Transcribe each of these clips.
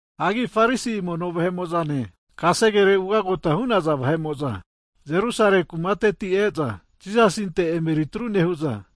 Hagi Farisi mono vahe'mo'zane kasegere ugagota hu'naza vahe'mo'za Jerusalemi kumateti' e'za, Jisasinte emeri atru nehu'za,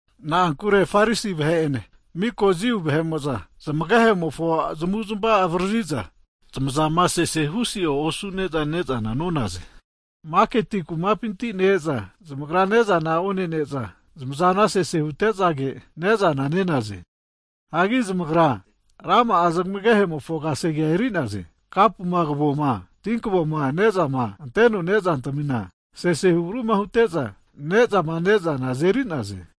Na'ankure Farisi vahe'ene, mika Jiu vahe'mo'za, zmagehe'mofo zamavu zmavama avaririza, zamazana sese huso'e osune'za ne'zana nonaze. Hagi maketi kumapinti ne-e'za, zamagra ne'zana onene'za zamazana sese hute'zage ne'zana nenaze. Hagi zamagra rama'a zmagehemofo kasegea eri'naze. Kapuma kavoma tinkavoma nezama anteno ne' zantamima sesehu agruma hute'za, ne'zama ne'zana azenerize.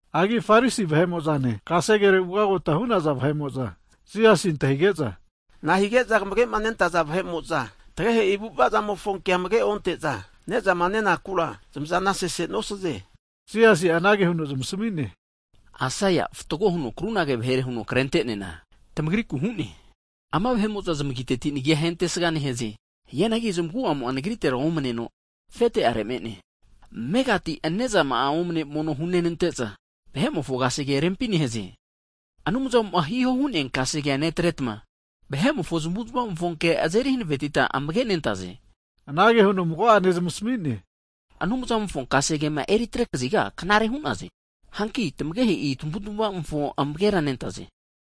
Hagi Farisi vahe'mo'zane, kasegere ugagota hu'naza vahe'mo'za Jisasina antahige'za, Nahige'za kamage'ma nentaza disaipol nagakamo'za tagehe'i avu'avamofo kea amage onte'za, ne'zama nenakura zamazana sese nosaze? Hazageno Jisasi'a anage huno zamasmi'ne, Aisaia'a fatgo huno krunage vahere huno krenteneana, tamagriku hu'ne, Ama vahe'mo'za zamagiteti nagi'a ahentesga nehaze. Hianagi zamagu'amo'a nagritera omaneno, afete'are me'ne. Amegati nezama'a omane mono hunenante'za, vahe'mofo kasege rempi nehaze. Hagi Anumzamo'ma hihoma hu'nea kasegea netre'za, vahe'mofo zamuzma'mofo ke azeri hanavetiza amage nentaze. Anage huno mago'ane zamasami'ne, Anumzamofo kasegema eritre kaziga knare hu'naze. Hanki tamagehe'i avu'ava'mofo amagera nentaze.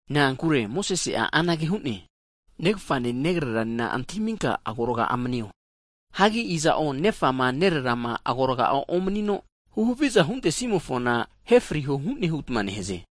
Na'ankure Mosesi'a anage hu'ne, negafane negreranena antahiminka agoraga'a manio. Hagi iza'o nefama nererama agoraga'a omanino, huhaviza huntesimofona, ahe friho hu'ne hutma nehaze.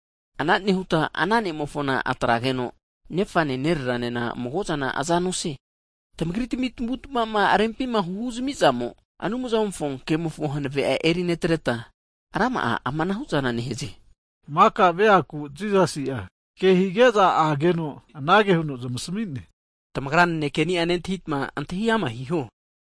Ana nehutma, ana ne'mofona atrageno nefane nereranena mago'zana aza nosie. Tamagri tami tamavu tamava'za rempima huzamiza'zamo higeta Anumzamofo ke'mofo hanavea eri netreta, rama'a ama anahu'zana nehaze. Hagi maka veaku Jisasi'a ke hige'za ageno anage huno zamasmi'ne, Tamagra nanekeni'a nentahita antahi ama' hiho.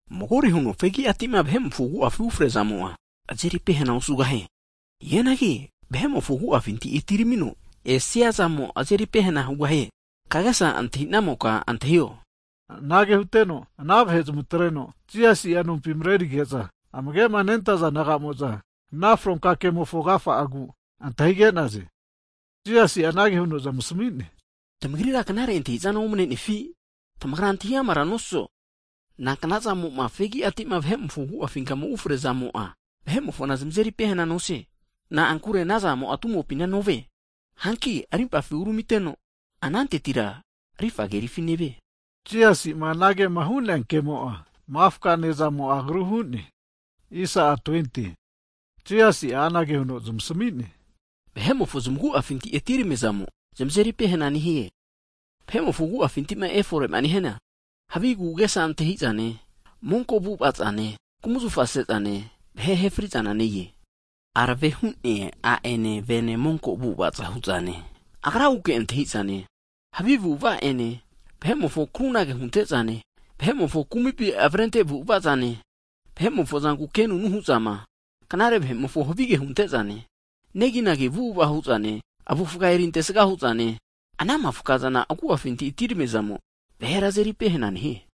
Magore huno fegiatima vahe'mofo agu'afima ufresiazamo'a, vahera azeri pehena osugahie. Hianagi vahe'mofo agu'afinti atiramino esiazamo, vahera azeri pehena hugahie. [Kagesa antahinamoka antahio.] Anage huteno, ana vahe zamatreno Jisasi'a nompi marerige'za, amage'ma nentaza disaipol naga'mo'za, ana fronka ke'mofo agafa'agu antahige'naze. Anante Jisasi'a anage huno zamasami'ne, Tamagrira knare antahi'zana omane'nefi? Tamagra antahi amara nosazo, inankanzamo'ma fegiatima vahe'mofo agu'afinka ufrezamo'a, vahe'mofona azeri pehena nosie. Na'ankure anazamo'a vahe'mofo agu'afina novie. Hanki rimpafi uramiteno, anantetira rifa kerifi nevie. (Jisasima anagema hu'nea kemo'a, mafka ne'zamo'a agru huno hu'ne.) Hagi Jisasi'a anage huno zamasami'ne, Vahe'mofo zmaguafinti atiramiazamo, zamazeri pehena nehie. Vahe'mofo agu'afinti'ma efore'ma nehiana, havi agu'agesa antahi'zane, monko zane, kumzafa se'zane, vahema ahe fri'zana ne-e, arave hu'nea a'ene vene monko avu'ava hu'zane, agraguke antahi'zane, havi avu'ava'ene, vahe'mofo krunage hunte'zane, vahe'mofo kumipi avrente avu'avazane, vahe'mofo zanku kenunu hu'zama, knare vahe'mofo havige hunte'zane, neginagi avu'ava hu'zane, avufga eriantesga hu'zane, ana mafkazana vahe'mofo agu'afinti atiramiazamo vahera azeri pehena nehie.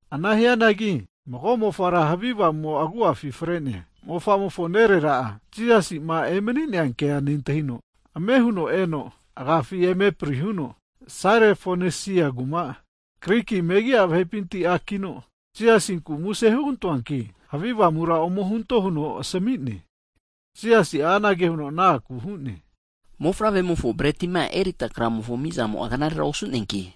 Ana hianagi mago mofara havi avamu'mo agu'afi fre'nea mofa'mofo nerera'a Jisasi'ma emani'nea kema nentahino, ame huno eno agafi eme prihuno, ana ara Sairofonesia kumateti Griki megi'a vahepinti a'kino, Jisasinkura muse hugantoanki havi avamura ome hunto huno asami'ne. Higeno Jisasi'a anage huno ana akura hu'ne, Mofavremofo bretima erita kramofo amizamo'a knarera osu'neanki,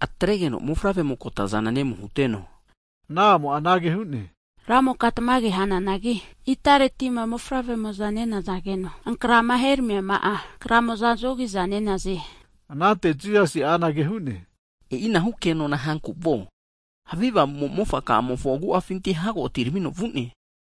atregeno mofavremo kotazana nemu huteno. Higeno ana a'mo'a anage hu'ne, Ramoka tamage hananagi, itaretima mofavre'mo'za nenazageno ankrama heramiama'a kramo'za zogi'za nenaze. Anante Jisasi'a anage hu'ne, E'inahu kenona hanku vuo, havi avamumo'a mofaka'amofo agu'afinti hago atiramino vu'ne.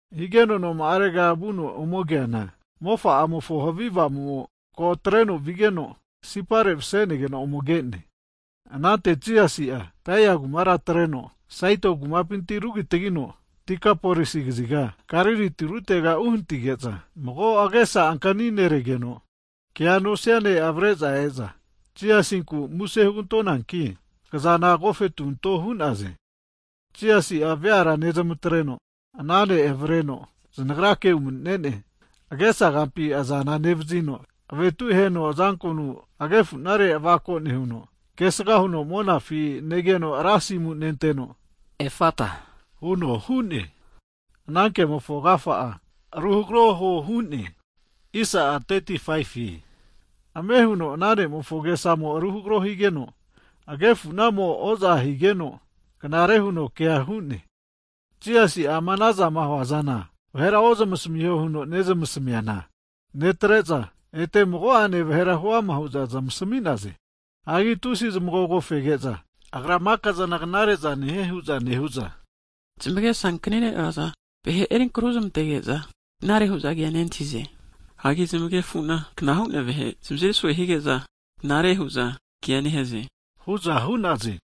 Higeno noma'arega vuno ome keana, mofa'amofona havi avamumo'a ko atreno vigeno, sipare mase'negeno ome ke'ne. Anante Jisasi'a Tairi kumara atreno, Saido kumapinti rugitagino Dekapolisi kaziga, Galili tirutega uhanatige'za, mago agesa ankaniregeno kea nosia ne' avare'za e'za, Jisasinku muse hugantonanki kazana agofetu anto hu'naze. Jisasi'a veara nezmatreno ana ne' avareno znagrake umanine'ne, agesa gampi azana nevazino, avetu aheno azankonu aganefunare avako nehuno, kesga huno monafi negeno ra asimu nenteno, Efata huno hu'ne, (ana kemofo agafa'a ruhagro huo hu'ne.) Higeno ame huno ana ne'mofo agesamo'a ru hagro higeno, agefunamo'a oza higeno, knare huno kea hu'ne. Jisasi'a amazama huazana vahera ozmasamiho huno nezmasamiana netre'za, ete mago'ane vahera huama hu'za zamasami'naze. Hagi tusi zamagogo fege'za, Agra mika' zana knare'za nehie hu'za nehu'za, zamagesa ankanire'naza vahe erinkro huzmantege'za, knare hu'za kea nentahize. Hagi zamagnefu'na kna hu'nea vahe zamazeri so'e hige'za knare hu'za kea nehaze hu'za hu'naze.